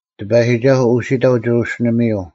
ᑎᐸᔨᒋᒐᓱᐤ ᐅᓯᑕᐤ ᒋᕈᓯᓕᒥᔪᐤ;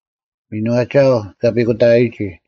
ᒥᓏᒋᐊᐤ ᑲ ᐱᑯᑕᐊᔨᒋ,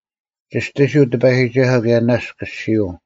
ᒋᔅᑎᓯᐤ ᑎᐸᔨᒋᒐᓱᐤ ᑭᔭ ᓇᔅᒡ ᑭᔅᒋᐅᐤ: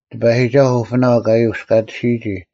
ᑎᐸᔨᒋᒐᓱᐤ ᐅᐱᓇᐤ ᑲ ᔪᔅᑲᑎᓯᔨᒋ: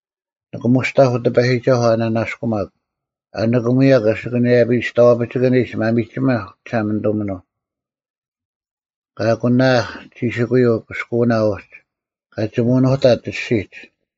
ᓂᑭᒧᔅᑕᐧᒄ ᑎᐸᔨᒋᒐᓱᐤ ᐊ ᓂᓇᔅᑯᒪᒄ; ᐊ ᓂᑭᒧᔭᒄ ᐊᓯᑭᓇᔭᐱᔾ ᒋᔍᐛᐱᒋᑭᓂᒡ ᒪᒥᒋᒥᐧᒄ ᒋᒋᓴᒪᓂᑐᒥᓄᐤ, ᑲ ᐊᑯᓇᐊᐊᐧᒃ ᒋᓯᑯᔪᐤ ᑭᔅᑯᐅᓇ ᐅᒡ, ᑲ ᒋᒧᓄᑕᑦ ᐊᔅᒋᒡ,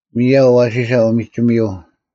ᒥᔭᐤ ᐊᐛᓯᓴ ᐅᒥᒋᒥᔪᐤ,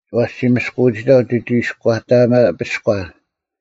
ᐛᔅ ᒋ ᒥᔅᑯᐅᑕᐤ ᒋ ᒋᒋᐃᔎᑕᒪᐱᔎ;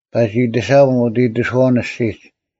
ᐸᒋ ᐃᑎᓴᒻ ᐅᑦ ᐃᑎᓱᐛᐅᓐ ᐊᔅᒋᒡ: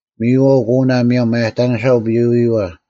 ᒥᔨᐛᐤ ᑯᓇ ᒧᔭᒻ ᒪᔭᑕᓂᓴ ᐅᐱᐎᔭᐛ: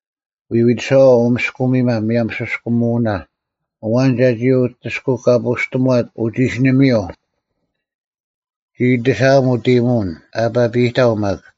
ᐎᐎᑎᓴᐛᐤ ᐅ ᒥᔅᑯᒥᒪ ᒧᔭᒻ ᓯᔅᑲᒧᐅᓇ: ᐊᐛᓐ ᒐᒋ ᐅᑎᔅᑯᐎᑲᐳᔅᑎᒺᑦ ᐅᒋᓯᓂᒥᔪᐤ? ᒋ ᐃᑎᓴᐊᒻ ᐅᑦ ᐃᔨᒧᐅᓐ, ᐊᐸᐱᔨᑕᐤ ᒪᒃ: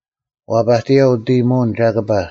ᐛᐸᑎᔭᐤ ᐅᑦ ᐃᔨᒧᐅᓐ ᒐᑭᐸ,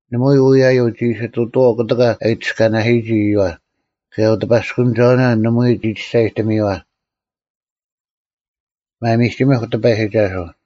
ᓇᒪᐎᔾ ᐅᔭᔪᐤ ᒋ ᐃᓯ ᑐᑐᐛᐤ ᑯᑎᑲ ᐊ ᐃᑎᔅᑲᓇᓯᔨᒋ ᐃᔪᐛ: ᑭᔭ ᐅᑎᐸᔅᑯᓂᒐᐅᓇ ᓇᒪᐎᔾ ᒋ ᒋᔅᒐᔨᑎᒥᔪᐛ᙮ ᒪᒥᒋᒥᐧᒄ ᑎᐸᔨᒋᒐᓱᐤ!